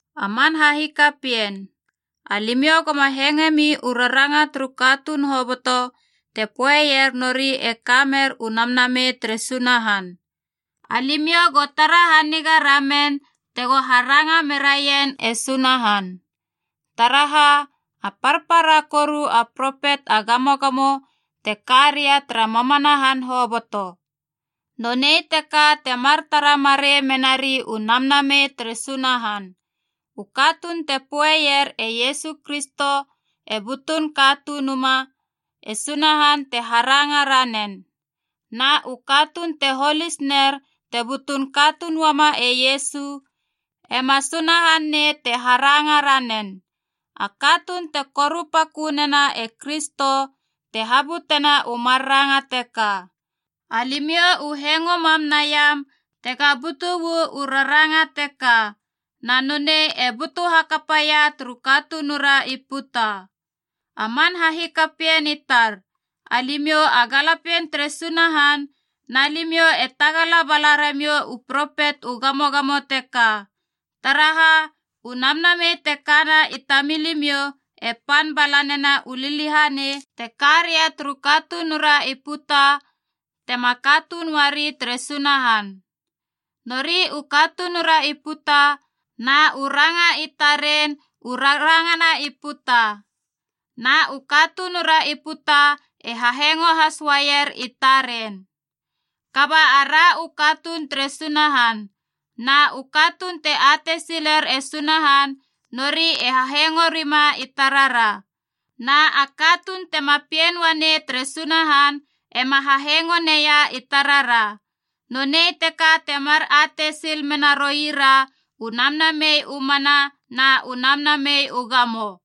A man hahikapien, alimiou goma hengoemi u raranga turu katuun hoboto te poeier nori e ka mer u Namnamei tere Sunahan. Alimiou go tara haniga ramen tego haranga meraien e Sunahan. Taraha, a parpara koru a propet a gamogamo te ka ria tara mamana han hoboto. Nonei teka temar tara marei menari u Namnamei tere Sunahan: u katuun te poeier e Iesu Kristo e butun Katunuma, e Sunahan te haranga ranen. Na u katuun te holis ner te butun katuun uama e Iesu, ema Sunahan nei te haranga ranen. A katuun te korupakö nena e Kristo te habutena u mar ranga teka. Alimiou u hengo mam naiam tega butu uu raranga teka, na nonei e butu hakapaia turu katunura i puta. A man hahikapien i tar, alimiou a galapien tere Sunahan na limiou e tagala bala ramiou u propet u gamogamo teka. Taraha, u Namnamei te kana i tamilimiou e pan bala nena u liliahanei te karia turu katunura i puta tema katuun uari tere Sunahan. Nori u katunura i puta na u ranga i taren u rarangana i puta, na u katunura i puta e hahengo has uaier i taren. Kaba ara u katuun tere Sunahan. Na u katuun te atei siler e Sunahan nori e hahengo rima i tarara. Na a katuun tema pien uanei tere Sunahan ema hahengo neia i tarara. Nonei teka temar atei sil menaroira u Namnamei u mana na u namnamei u gamo.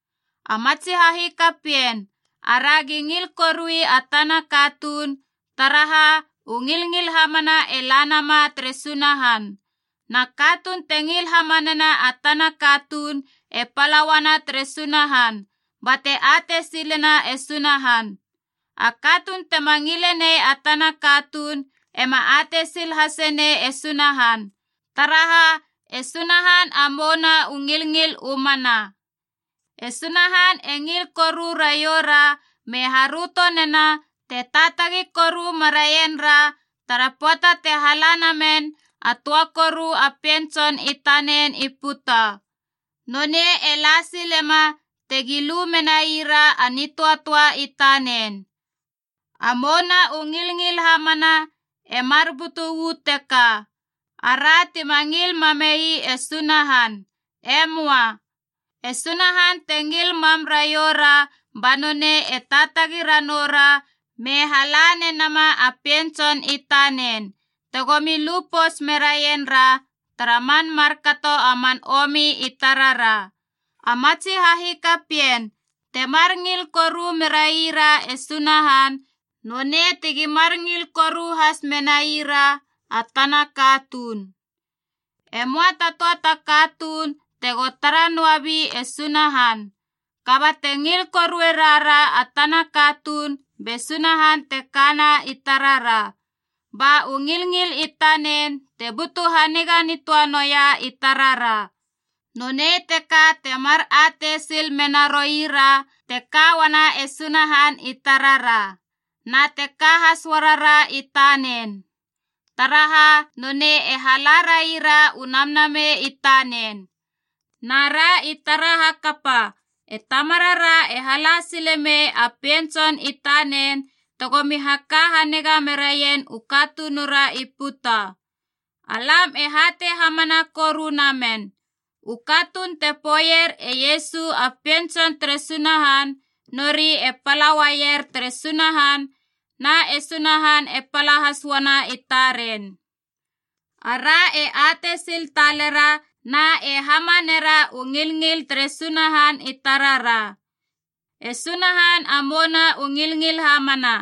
A matsi hahikapien, aragi ngil korui a tana katuun, taraha u ngilngil hamana e la nama tere Sunahan. Na katuun te ngil hamanena a tana katuun e pala uana tere Sunahan, bate atei silena e Sunahan. A katuun tema ngilenei a tana katuun ema atei sil hasenei e Sunahan, taraha e Sunahan a mouna u ngilngil u mana. E Sunahan e ngil koru raioura me haröto nena te taatagi koru meraien ra tara pöata te hala namen a töa koru a Pien Tson i tanen i puta. Nonei e la silema tegi lu menai ra a nitöatöa i tanen. A mouna u ngilngil hamana e mar butu uu teka: ara tima ngil mame ii e Sunahan. E möa. E Sunahan te ngil mam raioura ba nonei e taatagi ranoura me hala nenama a Pien Tson i tanen, tegomi lupouts meraien ra tara man markato a man omi i tarara. A matsi hahikapien, temar ngil koru meraira e Sunahan, nonei tegi mar ngil koru has menaira a tana katuun. Emoa ta töa ta katuun tego tara noabi e Sunahan. Kaba te ngil korue rara a tana katuun, be Sunahan te kana i tarara. Ba u ngilngil i tanen te butu haniga nitöa noa i tarara. Nonei teka temar atei sil menaroira te ka uana e Sunahan i tarara, na te ka has uarara i tanen, taraha nonei e hala raira u Namnamei i tanen. Na ra i tara hakapa, e Tamarara e hala sile mei a Pien Tson i tanen tegomi haka haniga meraien u katunura i puta. Alam e hatei hamana koru namen. U katuun te poeier e Iesu a Pien Tson tere Sunahan, nori e pala uaier tere Sunahan na e Sunahan e pala has uana i taren. Ara e atei sil talera, na e hamanera u ngilngil tere Sunahan i tarara. E Sunahan a mouna u ngilngil hamana.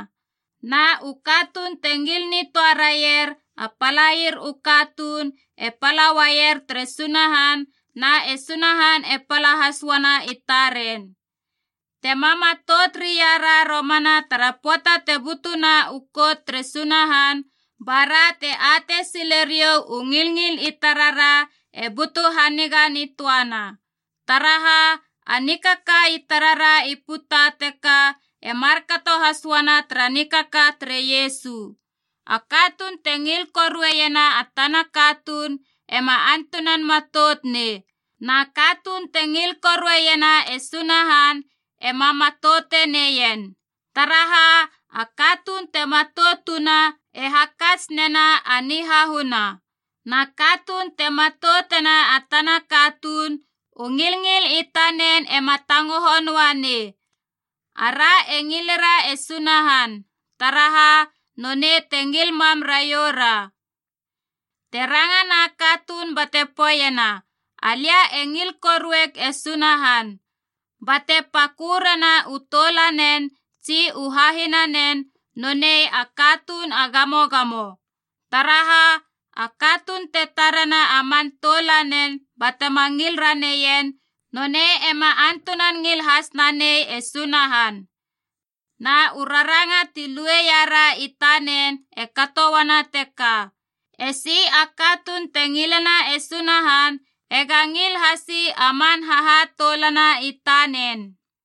Na u katuun te ngil nitöa raier a palair u katuun e pala uaier tere Sunahan na e Sunahan e pala has uana i taren. Tema matout reiara romana tara pöata te butuna u kout tere Sunahan, ba ra te atei silerou u ngilngil i tarara e butu haniga nitöana. Taraha, a nikaka i tarara i puta teka e markato has uana tara nikaka tere Iesu. A katuun te ngil korueiena a tana katuun ema antunan matout nei. Na katuun te ngil korueiena e Sunahan ema matoute neien. Taraha, a katuun te matoutuna e hakats nena a nihahuna. Na katuun te matoutena a tana katuun, u ngilngil i tanen ema tangoho noa nei. Ara e ngilera e Sunahan, taraha nonei te ngil mam raioura. Te rangana katuun bate poeiena, “Alia e ngil korueieg e Sunahan,” bate pakörena u toulanen tsi u hahinanen, nonei a katuun a gamogamo. Taraha, a katuun te tarena a man toulanen batema ngil raneien, nonei ema antunan ngil has nanei e Sunahan. Na u raranga ti lueiara i tanen e kato uana teka: esi a katuun te ngilena e Sunahan ega ngil hasi a man hahatoulana i tanen.